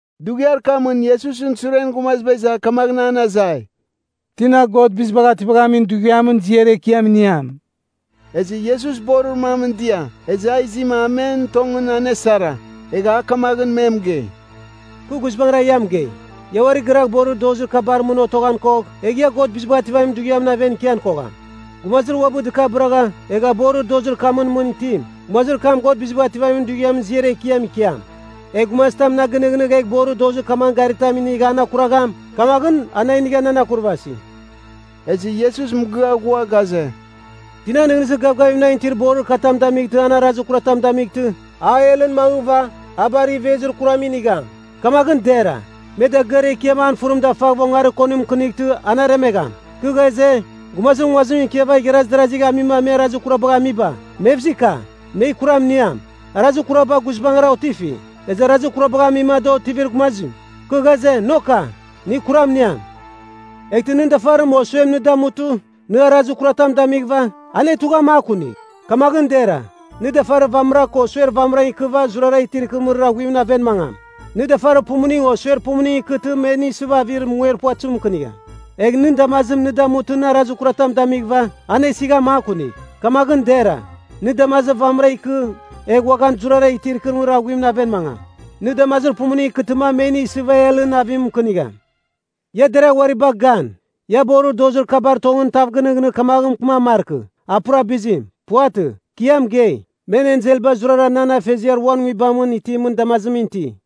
Dughiar kamɨn Iesusɨn suren gumaziba iza kamaghɨn an azai, “Tina God Bizibagh Ativamin Dughiamɨn ziar ekiam iniam?” Ezɨ Iesus borir mamɨn dia, ezɨ a izima a men tongɨn anesara. Egha a kamaghɨn me mɨgei, “Kɨ guizbangɨra ia mɨgei, ia uari gɨragh borir dozir kabar mɨn otoghan kogh, egh ia God Bizibagh Ativamin Dughiamɨn aven ikian kogham. Gumazir uabɨ dɨkabɨragha, egha borir dozir kamɨn mɨn itim, gumazir kam God Bizibagh Ativamin Dughiamɨn ziar ekiam ikiam. Egh gumazitam na gɨnɨghnɨgh egh borir dozir kamagh garitam inigh an akuragham, kamaghɨn a na inigha nan akurvasi.” Ezɨ Iesus mɨgɨa ghua ghaze, “Tina nɨghnɨzir gavgavim nan itir borir katam damightɨ an arazir kuratam damightɨ, a helɨn mangɨva, a bar ivezir kuram inigham. Kamaghɨn dera, me dagɨar ekiam an fɨrim dafaghɨva ongarir konim mɨkɨnightɨ an aremegham. “Kɨ ghaze, gumazir nguazimɨn ikiava igharaz darazigh amima me arazir kurabagh amiba, mevzika! Me kuram iniam! Arazir kuraba guizbangɨra otifi, ezɨ arazir kurabagh amima da otivir gumazim, kɨ ghaze, Noka! Nɨ kuram iniam! “Eghtɨ nɨn dafarim o suem nɨ damutɨ, nɨ arazir kuratam damighɨva, anetugh a makunigh. Kamaghɨn dera, nɨ dafarir vamɨra ko suer vamɨra ikɨva zurara itir ikɨrɨmɨrir aghuimɨn aven mangam. Nɨ dafarir pumuning o suer pumuning ikɨtɨ me nɨ isɨva avir munger puvatɨzim mɨkɨnigham. Egh nɨn damazim nɨ damutɨ nɨ arazir kuratam damighɨva, anesigh a makunigh. Kamaghɨn dera, nɨ damazir vamɨra ikɨ egh uaghan zurara itir ikɨrɨmɨrir aghuimɨn aven mangam. Nɨ damazir pumuning ikɨtɨma me nɨ isɨva helɨn avim mɨkɨnigham. “Ia deragh uari bagh gan! Ia borir dozir kabar tongɨn tav gɨnighnigh kamaghɨn mɨkɨman markɨ, a pura bizim. Puvatɨ. Kɨ ia mɨgei, men enselba zurara nan Afeziar uan Nguibamɨn itimɨn damazimɨn iti.”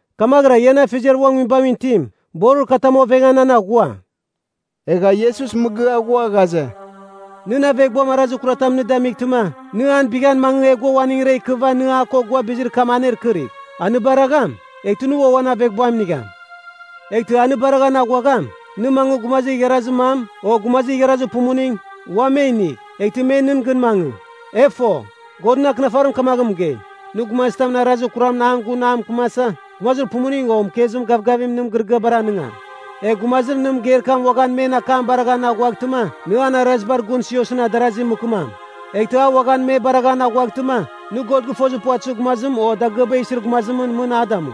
Kamaghɨra ian Afeziar uan Nguibamɨn itim, borir katam ovengan an aghua.” Egha Iesus mɨgɨa ghua ghaze, “Nɨn aveghbuam arazir kuram nɨ damightɨma, nɨ an bighan mangɨ egh gua uaningra ikɨva nɨ a ko gua bizir kam anekɨrigh. A nɨ baragham, eghtɨ nɨ ua uan aveghbuam inigham. Eghtɨ a nɨ baraghan aghuagham, nɨ mangɨ gumazir igharazir mam, o gumazir igharazir pumuning, uam me inigh. Eghtɨ me nɨn gɨn mangɨ. E fo, Godɨn Akɨnafarim kamaghɨn mɨgei, ‘Nɨ gumazitamɨn arazir kuram an gun a mɨkɨmasa, gumazir pumuning ko mɨkezim gavgavim nɨn mɨgɨrɨgɨabar anɨngam.’ Egh gumazir nɨ mɨgeir kam uaghan men akam baraghan aghuaghtɨma, nɨ an arazibar gun Siosɨn adarazi mɨkɨmam. Eghtɨ a uaghan me baraghan aghuaghtɨma, nɨ God gɨfozir puvatɨzir gumazim o dagɨaba isir gumazimɨn mɨn a damu.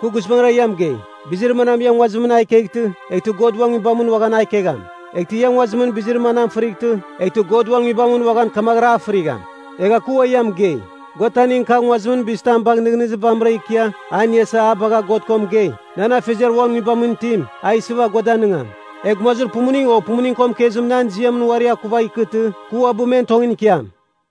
“Ki guizbangɨra ia mɨgei, bizir manam ia nguazimɨn a ikeghtɨ, eghtɨ God uan Nguibamɨn uaghan a ikegham. Eghtɨ ia nguazimɨn bizir manam a fɨrightɨ, eghtɨ God uan Nguibamɨn uaghan kamaghɨra a fɨrigham. “Egha kɨ ua ia mɨgei, gua taning kagh nguazimɨn bizitam bagh nɨghnɨzir vamɨra ikia a iniasa a bagha God ko mɨgei, nan Afeziar uan Nguibamɨn itim a isɨva gua danɨngam. Egh gumazir pumuning, o pumuning ko mɨkezim nan ziam uari akuvagh ikɨtɨ, kɨ uabɨ men tongɨn ikiam.”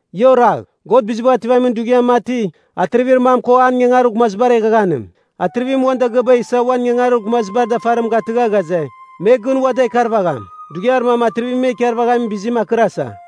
“Ia oragh. God Bizibagh Ativamin Dughiam mati, atrivir mam ko an ingangarir gumazibar eghaghanim. Atrivim uan dagɨaba isa uan ingangarir gumazibar dafarim gatɨgha ghaze, me gɨn ua da ikarvagham. Dughiar mam atrivim me a ikarvaghamin bizim akɨrasa.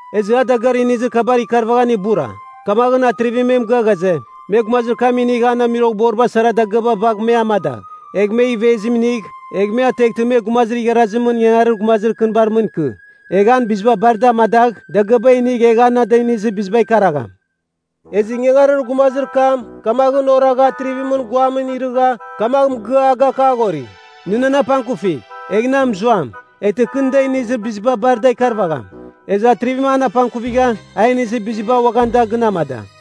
Ezɨ a dagɨar inizir kabar ikarvaghan ibura. Kamaghɨn atrivim me mɨgɨa ghaze, me gumazir kam inigh an amuiroghboriba sara dagɨaba bagh me amadagh, egh men ivezim inigh. Egh me ateghtɨ me gumazir igharazimɨn ingangarir gumazir kɨnibar mɨn ikɨ. Egh an biziba bar da amadagh, dagɨaba inigh egh a na da inizir biziba ikaragham. Ezɨ ingangarir gumazir kam kamaghɨn oragha atrivimɨn guamɨn irɨgha kamagh mɨgɨa a gakaghori, ‘Nɨ nan apangkuvigh, egh na mɨzuam. Eghtɨ kɨ nɨ da inizir biziba bar da ikarvagham.’ Ezɨ atrivim an apangkuvigha, a inizir biziba uaghan da gɨn amada.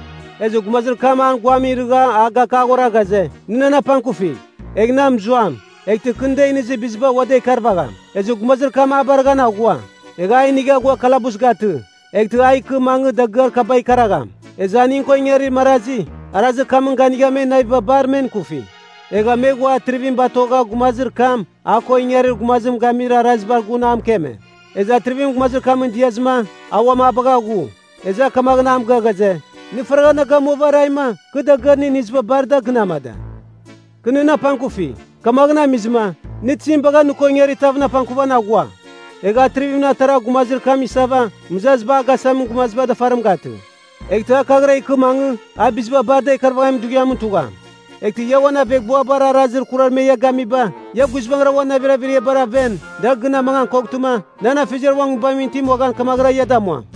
“Ezɨ gumazir kam an guamɨn irɨgha a gakaghora ghaze, ‘Nɨ nan apangkufigh, egh na mɨzuam. Eghtɨ kɨ nɨ da inizir biziba ua da ikarvagham.’ Ezɨ gumazir kam a baraghan aghua, egha a inigha ghua kalabus gatɨ, eghtɨ a ikɨ mangɨ dagɨar kaba ikaragham. “Ezɨ aning ko ingarir marazi, arazir kamɨn ganigha men naviba bar men ikufi. Egha me ghua atrivim batogha gumazir kam, a ko ingarir gumazim gamizir arazibar gun a mɨkeme. Ezɨ atrivim gumazir kamɨn diazɨma, a uam a bagha ghu. Ezɨ a kamaghɨn a mɨgɨa ghaze, ‘Nɨ bar ingangarir gumazir kuram! Nɨ faragha na gamuava araima, kɨ dagɨar nɨ iniziba bar da gɨn amada. Kɨ nɨn apangkufi, kamaghɨn amizɨma, nɨ tizim bagha nɨ ko ingarir tavɨn apangkuvan aghua?’ Egha atrivim atarava gumazir kam isava, mɨzaziba agasamin gumazibar dafarim gatɨ. Eghtɨ a kaghɨra ikɨ mangɨ, a biziba bar da ikarvaghamin dughiamɨn tugham. “Eghtɨ ia uan aveghbuabar arazir kurar me ia gamiba, ia guizbangɨra uan navir averiabar aven, da gɨn amangan koghtɨma, nan Afeziar uan Nguibamɨn itim uaghan kamaghɨra ia damuam.”